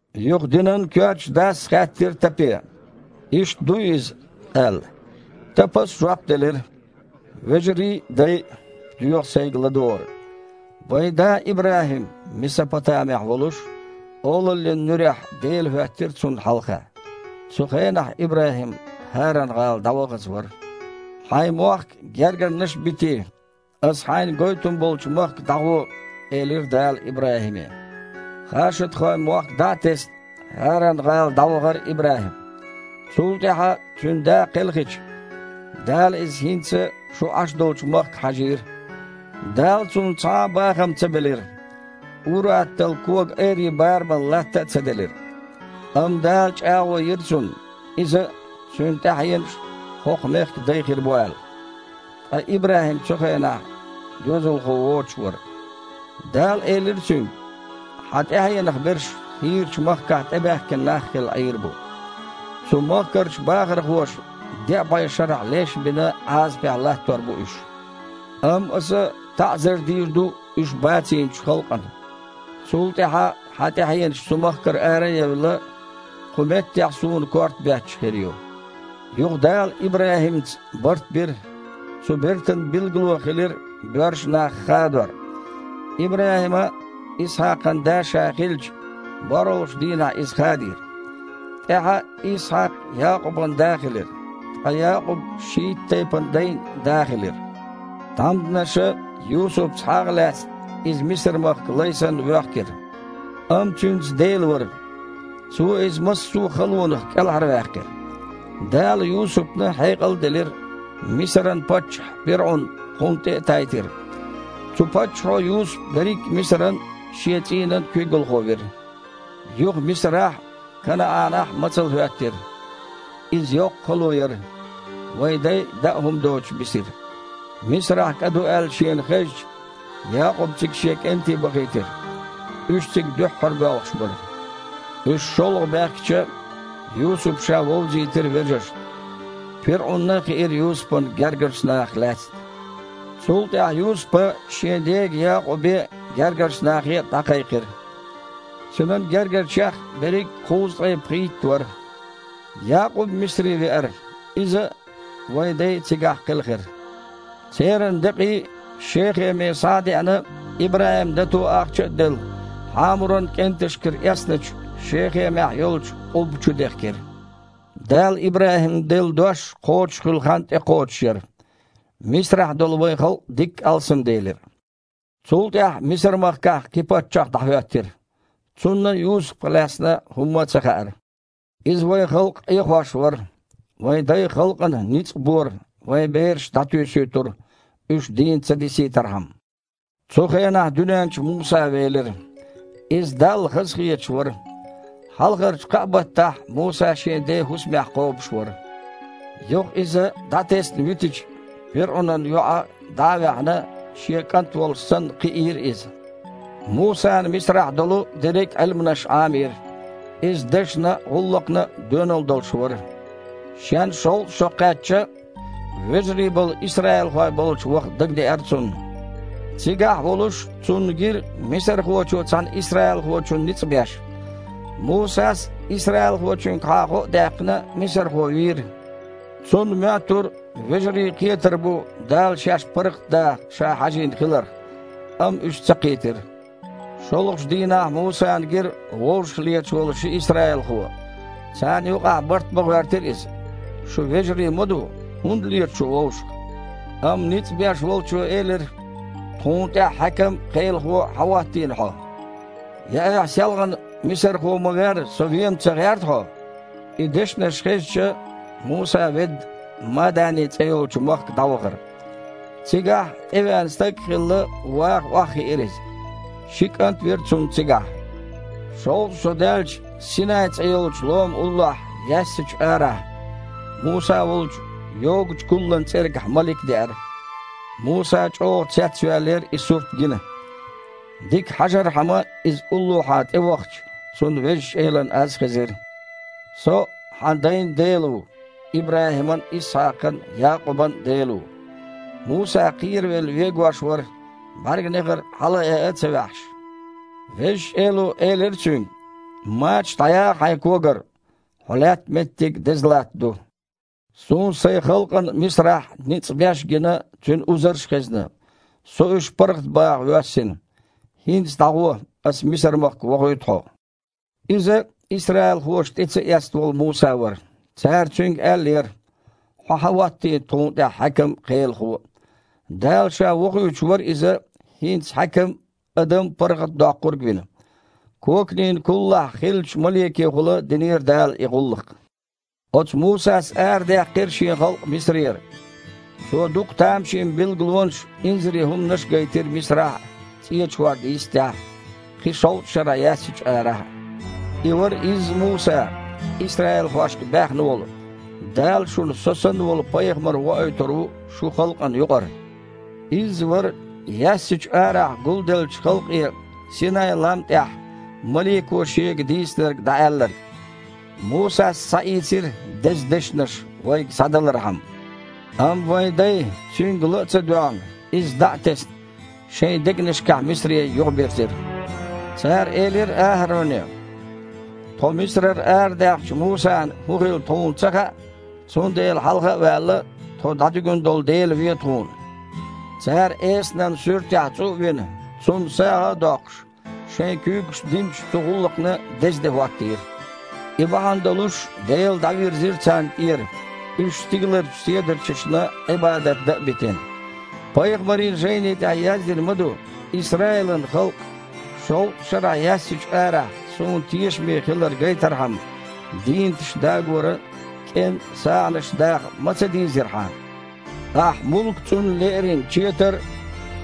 Юха динан коьртачу дас хаьттира Тапе: «Иштта дуй иза?» – аьлла. Тапас жоп делира: «Вежарий а, дай а! Доьху сайга ладогІар. Вайн да ИбрахІим Месопотамехь волуш, Олаллин нуьрехь Дела хІоьттира цунна хьалха. Цу хенахь ИбрахІим ХІаран-гІала дІавахаза вара. „Хьайн мохк а, гергарнаш а битий, Аса хьайна гойтун болчу махка дІагІо“, – элира Дала ИбрахІиме. Хашадхойн мохк дІа а тесна, ХІаран-гІала дІавахара ИбрахІим. Цул тІаьхьа, цуьнан да кхелхича, Дала иза хІинца шу Іаш долчу махка хьажийра. Дала цунна цхьа а бахам ца белира, ур-атталла коган айрин барамал латта а ца делира. Амма Дала чІагІо йира цунна, иза а, цуьнан тІаьхьенаш а хІокху мехкан дай хир бу аьлла. Ткъа ИбрахІим цу хенахь доьзалхо воцуш вара. Дала элира цуьнга: „Хьан тІаьхьенах берш хийрачу махкахь тІебаьхкина нах а хилла Іийр бу. Цу махкарчу бахархоша, деа бІе шарахь леш а бина, Іазапехь латтор бу уьш. Амма Аса таІзар дийр ду уьш бацийначу халкъана. Цул тІаьхьа хьан тІаьхьенаш цу махкара ара а евлла, кху меттехь Суна корта бетташ хир ю“. Юха Дала ИбрахІимца барт бира, цу бертан билгало хилира боьрша нах хадор. ИбрахІима, Исхьакхан да ша хилча, борхІалгІачу дийнахь иза хадийра. ТІаьхьа Исхьакх Якъубан да хилира, ткъа Якъуб шийтта тайпанан дайн да хилира. Тхьамданаша, Юсупца хьагІ а лаьцна, иза Мисар-махка лай санна воьхкира. Амма цуьнца Дела вара, Цо иза массо а халонах кІелхьарваьккхира. Дала Юсупна хьекъал а делира, Мисаран паччахь, пирІун, кхунна тІе а тайтира. Цу паччахьо Юсуп берриг а Мисаран а, шен цІийнан а куьйгалхо вира. Юха Мисарахь а, КанаІанахь а мацалла хІоьттира. Иза йоккха хало яра. Вайн дай даа хІума доцуш бисира. Мисарахь кІа ду аьлла шена хезча, Якъуба цига шен кІентий бахийтира. Уьш цига дуьххьара боьлхуш бара. Уьш шолгІа баьхкича, Юсупа ша вовзийтира вежаршна. ПирІунна а хиира Юсупан гергарчу нахах лаьцна. Цул тІаьхьа Юсупа шен дега Якъубе а, гергарчу нахе а дІакхайкхира. Цуьнан гергарчех берриг а кхузткъе пхийтта вара. Якъуб Мисаре веара. Иза а, вайн дай а цигахь кхелхира. Церан декъий Шехеме схьа а деана, ИбрахІима, дато ахча а делла, Хьамуран кІенташкара эцначу Шехемехь йолчу къубба чу дехкира. Дала ИбрахІимна делла дош кхочушхуьлу хан тІекхочуш яра, Мисарахь долу вайн халкъ дикка алсамделира. Цул тІаьхьа Мисар-махкахь кхин паччахь дІахІоьттира. Цунна Юсупах лаьцна хІумма а ца хаьара. Иза вайн халкъ Іехош вара. Вайн дайн халкъана ницкъ бора, вайн бераш дІатуьйсуьйтура, уьш дийна ца дисийтархьама. Цу хенахь дуьнен чу Муса велира. Иза Далла хазахеташ вара. Хьалхарчу кхаа баттахь Муса шен ден хІусамехь кхобуш вара. Юха иза дІатесна витича, пирІунан йоІа, дІа а ваьхьна, шен кІант волуш санна кхиийра иза. Мусана Мисарахь долу дерриг а Іилманаш Іамийра. Иза дашна а, гІуллакхна а доьналла долуш вара. Шен шовзткъа шо кхаьчча, вежарий болу исраилхой болчу ваха дагадеара цунна. Цигахь волуш цунна гира мисархочо цхьана исраилхочунна ницкъ беш. Мусас, исраилхочуьнгахьа гІо а даьккхина, мисархо вийра. Цунна моьттура вежарий кхетар бу, Дала шаьш паргІатдаха ша хьажийна хиларх. Амма уьш ца кхийтира. ШолгІачу дийнахь Мусана гира вовшахлеташ волу ши исраилхо. Царна юкъахь бартбан гІоьртира иза: „Шу вежарий ма ду! ХІунда лета шу вовшах?“ Амма ницкъ беш волчо элира: „Тхуна тІехь хьаькам а, кхелахо а хьан хІоттийна хьо? Я айхьа селхана мисархо ма верра, со а вен-м ца гІерта хьо?“ И дешнаш хезча, Муса, ведда, Мадани цІе йолчу махка дІавахара. Цигахь, тІевеана стаг а хилла, ваха охьахиира иза. Ши кІант а вира цунна цигахь. Шовзткъа шо даьлча, Синай цІе йолчу лома уллохь яьссачу арахь Муса волчу йогучу куллан цІергахь малик деара. Муса чІогІа цецваьллера и сурт гина. Дика хьажархьама иза уллохьа тІевахча, цунна Везачу Элан аз хезира: „Со – хьан дайн Дела ву, ИбрахІиман а, Исхьакхан а, Якъубан а Дела ву“. Муса кхеравелла вегош вара, бІаьрганегІар хьалаайа а ца ваьхьаш. Везачу Эло элира цуьнга: „Мачаш дІаяха хьайн когара, хьо лаьтта меттиг деза латта ду. Суна Сайн халкъана Мисарахь ницкъ беш а гина, цуьнан узарш а хезна. Со уьш паргІатбаха воьссина. ХІинца дІагІо, Аса Мисар-махка вохуьйту хьо“. Иза исраилхоша тІе ца эцна волу Муса вара. Цара цуьнга аьллера: „Хьо хьан хІоттийна тхуна тІехь хьаькам а, кхелахо а?“ Дала Ша вохуьйтуш вара иза хІинца хьаькам а, адам паргІатадоккхург а вина. Коканийн куллахь хиллачу маликехула динера Дала и гІуллакх. Оцу Мусас арадаьккхира шен халкъ Мисарера. Цо дукха тамашийна билгалонаш а, инзаре хІуманаш а гайтира Мисарахь а, ЦІечу хІорда йистехь а, кхин шовзткъа шарахь яьссачу арахь а. И вара изза Муса, исраилхошка баьхна волу: „Дала шуна со санна волу Пайхамар воуьйтур ву шун халкъана юкъара“. Изза вара яьссачу арахь гулделлачу халкъе Синай-лам тІехь малико шега дийцинарг дІааьлларг. Мусас схьаийцира деза дешнаш вайга схьадалархьама. Амма вайн дай, цуьнга ла а ца доьгІна, иза дІа а тесна, шайн дегнашкахь Мисаре юхабирзира. Цара элира АхІароне: „Тхо Мисарара арадаьхначу Мусана хІун хилла тхуна ца хаьа, цундела, хьалха а ваьлла, тхо дІадуьгун долу дела ве тхуна“. Цара эсанан суьртехь цІу а вина, цунна сагІа а доккхуш, шайн куьйгашца динчу цу гІуллакхна деза де хІоттийра. И бахьана долуш Дела дІавирзира царна тІера, уьш стигаларчу седарчашна Іибадат дан а битина. Пайхамарийн жайни тІехь яздина ма ду: „Исраилан халкъ! Шовзткъа шарахь яьссачу арахь Суна тешаме хилар гайтархьама, дийнаташ дагоран а, кІен а сагІанаш даха ма ца дийзира хьан! Ахь Мулка-цІунна лерина четар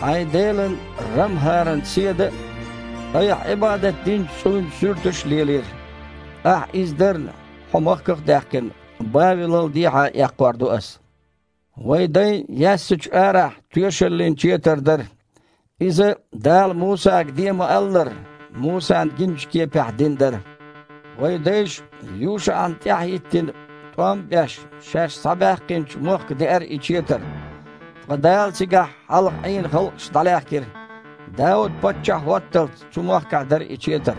а, хьайн Делан РамхІаран седа а, айхьа Іибадат динчу цІуйн суьрташ а лелийра. Ахь иза дарна, хьо махках а даьккхина, Бавелал дехьа эккхор ду Ас“. Вайн дайн яьссачу арахь Тоьшаллин Четар дара. Иза Дала Мусага де ма-аллара, Мусана гиначу кепехь дина дара. Вайн дайша ЮшаІна тІаьхьахІиттина, тІом а беш, шаьш схьабаьккхинчу махка деара и четар. Ткъа Дала цигахь хьалха Іийна халкъаш дІалаьхкира. Дауд паччахь хІотталц цу махкахь дара и четар.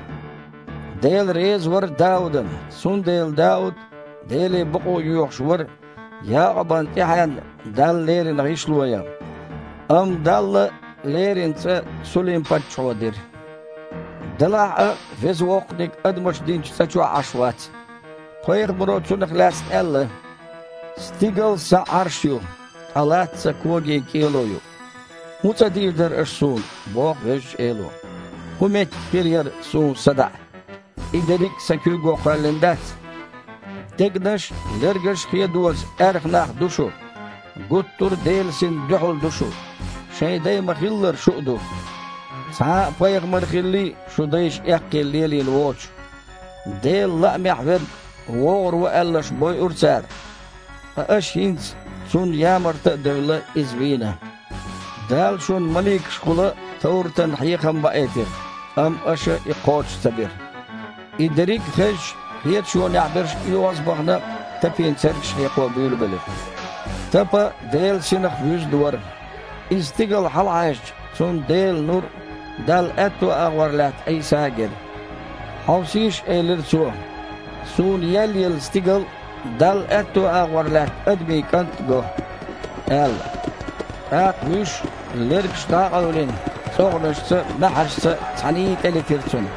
Дела реза вара Даудана, цундела Дауд Деле бакъо йоьхуш вара Якъубан тІаьхьенна Далла лерина гІишло ян. Амма Далла лерина цІа Сулим-паччахьо дира. Делахь а, Веза Воккханиг адамаша динчу цІа чохь Іаш вац. Пайхамаро цунах лаьцна аьлла: „Стигал Сан Іарш ю, ткъа латта Сан когийн кІело ю. ХІун цІа дийр дара аша Суна? – боху Везачу Эло. ХІун меттиг хир яра Суна садаІа? И дерриг а Сан куьйго кхоьллина дац?“ Дегнаш а, лергаш а хедоза аьрха нах ду шу! Гуттар а Делан Синна дуьхьал ду шу! Шайн дай ма-хиллара шу а ду. Цхьа а пайхамар хиллий, шун дайша эккхийна лелийна воцуш? Делан Лаамехьверг вогІур ву аьлларш бойура цара, ткъа аша хІинца, Цунна ямарта а девлла, Иза а вийна. Дала шуна маликашкахула товратан хьехам баийтира, амма аша и кхочуш ца бира». И дерриг а хезча, кхеташонехь берш, оьгІазбахна, Тапина цергаш хьекхо буьйлабелира. Тапа Делан Синах вуьзна вара. Иза стигала хьалахьаьжча, цунна Делан нур а, Далла аьтту агІор лаьтта Іийса а гира. «Хьовсийша, – элира цо, – суна еллаелла стигал а, Далла аьтту агІор лаьтта Адамийн КІант а го», – аьлла. ТІаккха вуьш, лергаш дІа а къевлина, цІогІанашца, маьхьаршца цхьаьний тІелетира цунна.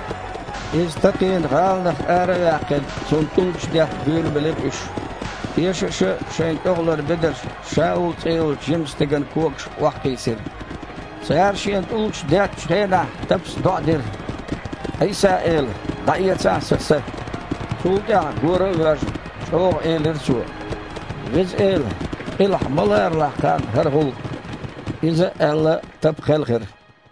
Иза такхийна гІаланах ара а ваьккхина, цунна тІулгаш детта буьйлабелира уьш. Тешаша шайн тІехулара бедарш Шаул цІе йолчу жимачу стеган когашка охьакхийсира. Цара шена тІулгаш деттачу хенахь, Тапас доІа дира: «Іийса-Эла, дІаэцахьа сан са!» Цул тІаьхьа, гора а воьжна, чІогІа элира цо: «Веза Эла, къилахь ма ларалахь кхарна хІара гІуллакх!» Иза а аьлла, Тапа кхелхира.